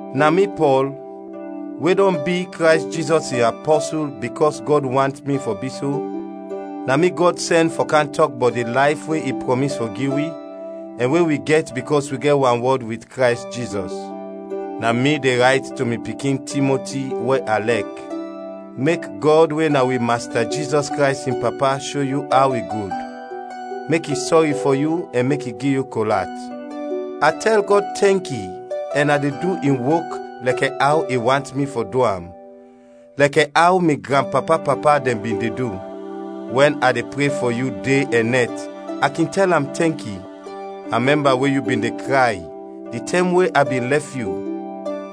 Na mi Pɔl, we dɔn bi Krays Jizɔs in apɔsul bikɔs Gɔd want mi fɔ bi so, na mi Gɔd sɛn fɔ kam tɔk bɔt di layf we i prɔmis fɔ gi wi, ɛn we wi gɛt bikɔs wi gɛt wanwɔd wit Krays Jizɔs. Na mi de rayt to mi pikin, Timoti, we a lɛk. Mek Gɔd we na wi Masta Jizɔs Krays in Papa sho yu aw i gud, mek i sɔri fɔ yu ɛn mek i gi yu kol at. A tɛl Gɔd tɛnki ɛn a de du in wok lɛkɛ aw i want mi fɔ du am, lɛkɛ aw mi granpapa-papa dɛn bin de du. Wɛn a de pre fɔ yu de ɛn nɛt a kin tɛl am tɛnki. A mɛmba we yu bin de kray di tɛm we a bin lɛf yu,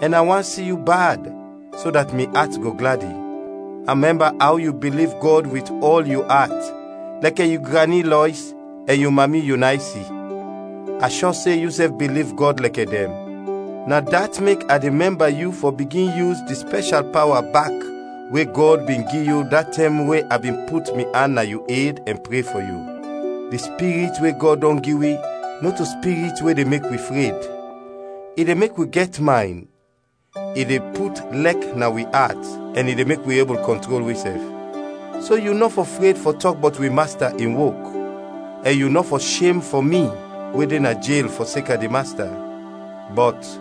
ɛn a want si yu bad, so dat mi at go gladi. A mɛmba aw yu biliv Gɔd wit ɔl yu at lɛkɛ yu grani Lɔis ɛn yu mami Yunaysi. A shɔ se yusɛf biliv Gɔd lɛkɛ dɛn. Na dat mek a de mɛmba yu fɔ bigin yus di spɛshal pawa bak we Gɔd bin gi yu da tɛm we a bin put mi an na yu ed ɛn pre fɔ yu. Di Spirit we Gɔd dɔn gi wi nɔto spirit we de mek wi fred, i de mek wi gɛt maynd, i de put lɛk na wi at ɛn i de mek wi ebul kɔntrol wisɛf. So yu nɔ fɔ fred fɔ tɔk bɔt wi Masta in wok; ɛn yu nɔ fɔ shem fɔ mi we de na jel fɔseka di Masta. Bɔt,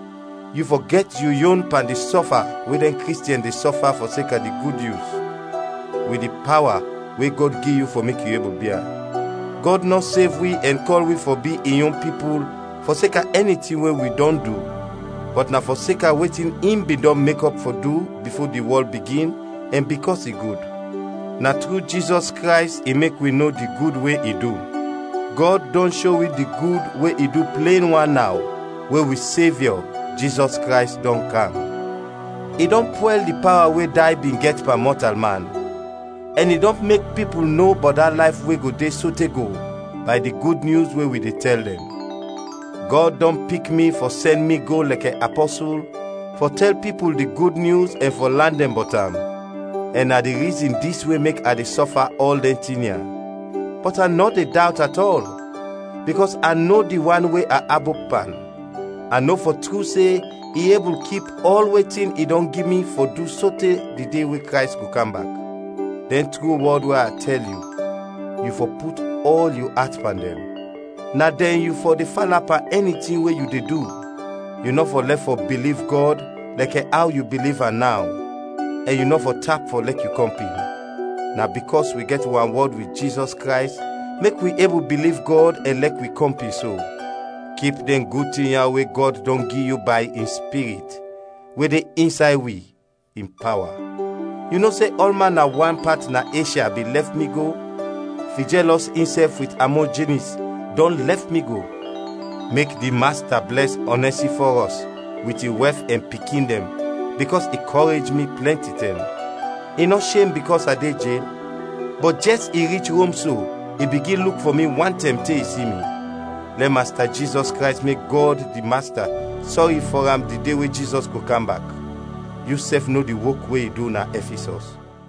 yu fɔ gɛt yu yon pan di sɔfa we dɛn Kristiɛn de sɔfa fɔseka di Gud Nyus, wit di pawa we Gɔd gi yu fɔ mek yu ebul bia. Gɔd nɔ sev wi ɛn kɔl wi fɔ bi in yon pipul fɔseka ɛni tin we wi dɔn du, bɔt na fɔseka wetin in bin dɔn mekɔp fɔ du bifo di wɔl bigin ɛn bikɔs i gud. Na tru Jizɔs Krays i mek wi no di gud we i du. Gɔd dɔn sho wi di gud we i du plen wan naw, we wi Sevyɔ, Jizɔs Krays dɔn kam. I dɔn pwɛl di pawa we day bin gɛt pan mɔtalman, ɛn i dɔn mek pipul no bɔt da layf we go de sote go, bay di Gud Nyus we wi de tɛl dɛn. Gɔd dɔn pik mi fɔ sɛn mi go lɛkɛ apɔsul fɔ tɛl pipul di Gud Nyus ɛn fɔ lan dɛn bɔt am, ɛn na di rizin dis we mek a de sɔfa ɔl dɛn tin ya. Bɔt a nɔ de dawt at ɔl, bikɔs a no di wan we a abop pan; a no fɔ tru se i ebul kip ɔl wetin i dɔn gi mi fɔ du sote di de we Krays go kam bak. Dɛn tru wɔd we a tɛl yu, yu fɔ put ɔl yu at pan dɛn; na dɛn yu fɔ de fala pan ɛni tin we yu de du, yu nɔ fɔ lɛf fɔ biliv Gɔd lɛkɛ aw yu biliv am naw, ɛn yu nɔ fɔ tap fɔ lɛk yu kɔmpin. Na bikɔs wi gɛt wanwɔd wit Jizɔs Krays mek wi ebul biliv Gɔd ɛn lɛk wi kɔmpin so. Kip dɛn gud tin ya we Gɔd dɔn gi yu bay in Spirit, we de insay wi, in pawa. Yu no se ɔlman na wan pat na Eshya bin lɛf mi go. Fijɛlɔs insɛf wit Amojinis dɔn lɛf mi go. Mek di Masta blɛs Onɛsifɔrɔs wit in wɛf ɛn pikin dɛn bikɔs i kɔrej mi plɛnti tɛm. I nɔ shem bikɔs a de jel, bɔt jɛs i rich Rom so, i bigin luk fɔ mi wantɛm te i si mi. Lɛ Masta Jizɔs Krays mek Gɔd di Masta sɔri fɔ am di de we Jizɔs go kam bak! Yusɛf no di wok we i du na Ɛfisɔs.